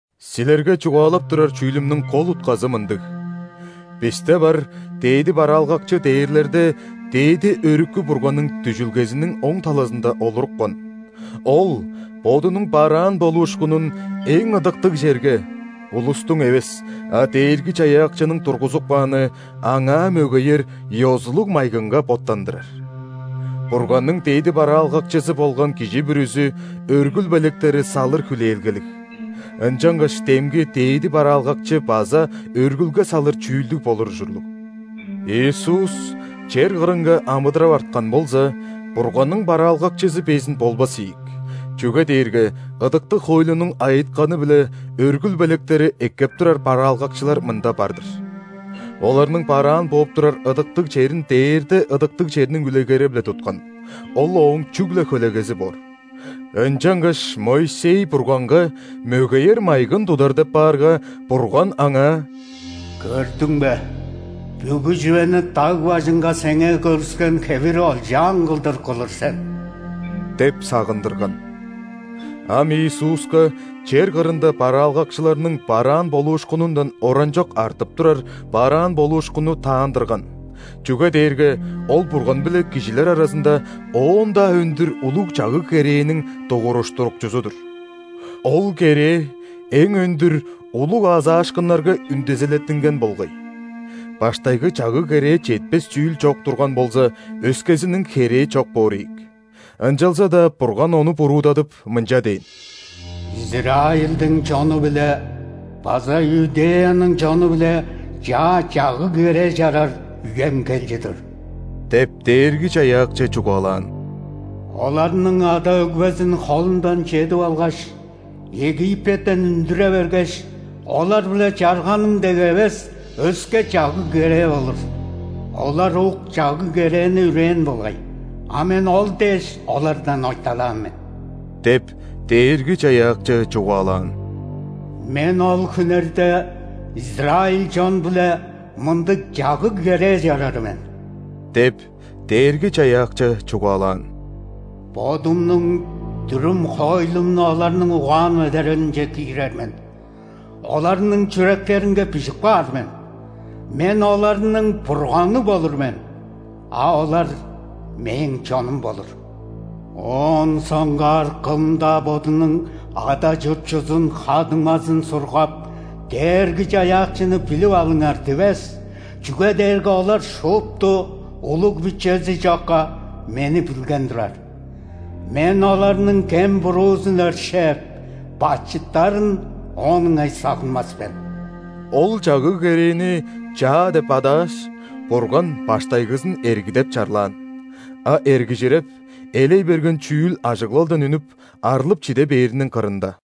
Силерге чугаалап турар чүүлүмнүң кол утказы мындыг: бисте бар Дээди бараалгакчы дээрлерде Дээди Өрүкү Бурганның дүжүлгезиниң оң талазында олурупкан, Ол Бодунуң бараан болуушкунун эң ыдыктыг черге – улустуң эвес, а Дээрги-Чаяакчының тургузуп кааны, Аңаа мөгеер ёзулуг майгынга боттандырар. Бурганның дээди бараалгакчызы болган кижи бүрүзү өргүл белектери салыр хүлээлгелиг, ынчангаш демги Дээди бараалгакчы база өргүлге салыр чүүлдүг болур ужурлуг. Иисус чер кырынга амыдырап арткан болза, Бурганның бараалгакчызы безин болбас ийик, чүге дээрге ыдыктыг хоойлунуң айытканы-биле өргүл белектери эккеп турар бараалгакчылар мында бар-дыр. Оларның бараан бооп турар ыдыктыг черин дээрде ыдыктыг черниң үлегери-биле туткан, ол ооң чүгле хөлегези боор. Ынчангаш Моисей Бурганга мөгеер майгын тудар деп баарга, Бурган аңаа: «Көрдүң бе, бүгү чүвени даг бажынга сеңээ көргүскен хевири олчаан кылдыр кылыр сен» – деп сагындырган. Ам Иисуска чер кырында бараалгакчыларның бараан болуушкунундан оранчок артып турар бараан болуушкунну даандырган, чүге дээрге Ол Бурган биле кижилер аразында оон-даа өндүр улуг чагыг-керээниң Дугуруштурукчузу-дур. Ол керээ эң өндүр улуг аазаашкыннарга үндезилеттинген болгай. Баштайгы чагыг-керээ четпес чүүл чок турган болза, өскезиниң херээ чок боор ийик. Ынчалза-даа Бурган ону буруудадып, мынча дээн:«Израильдиң чону-биле база Иудеяның чону-билечаа чагыг-керээ чарар үем кел чыдыр – деп, Дээрги-Чаяакчы чугаалаан. – Оларның ада-өгбезин холундан чедип алгаш, Египеттен үндүре бергеш,олар-биле чарганым дег эвес, өске чагыг-керээ болур.Олар ук чагыг-керээни үрээн болгай,а Мен ол дээш олардан ойталаан мен – деп, Дээрги-Чаяакчы чугаалаан. – Мен ол хүннерде израиль чон-биле мындыг чагыг-керээ чарар мен – деп, Дээрги-Чаяакчы чугаалаан. –Бодумнуң дүрүм-хоойлумну оларның угаан-медерелинче киирер мен,оларның чүректеринге бижип каар мен!Мен оларның Бурганы болур мен, а олар Мээң чонум болур. Оон соңгаар кым-даа бодунуң ада-чуртчузун, ха-дуңмазын сургап:„Дээрги-Чаяакчыны билип алыңар!“ – дивес,чүге дээрге олар шупту, улуг-бичези чокка, Мени билген турар. Мен оларның кем-буруузун өршээп, бачыттарын оон ыңай сагынмас мен». Ол чагыг-керээни «чаа» деп адааш, Бурган баштайгызын эрги деп чарлаан, а эргижиреп, элей берген чүүл ажыглалдан үнүп, арлып-чиде бээриниң кырында.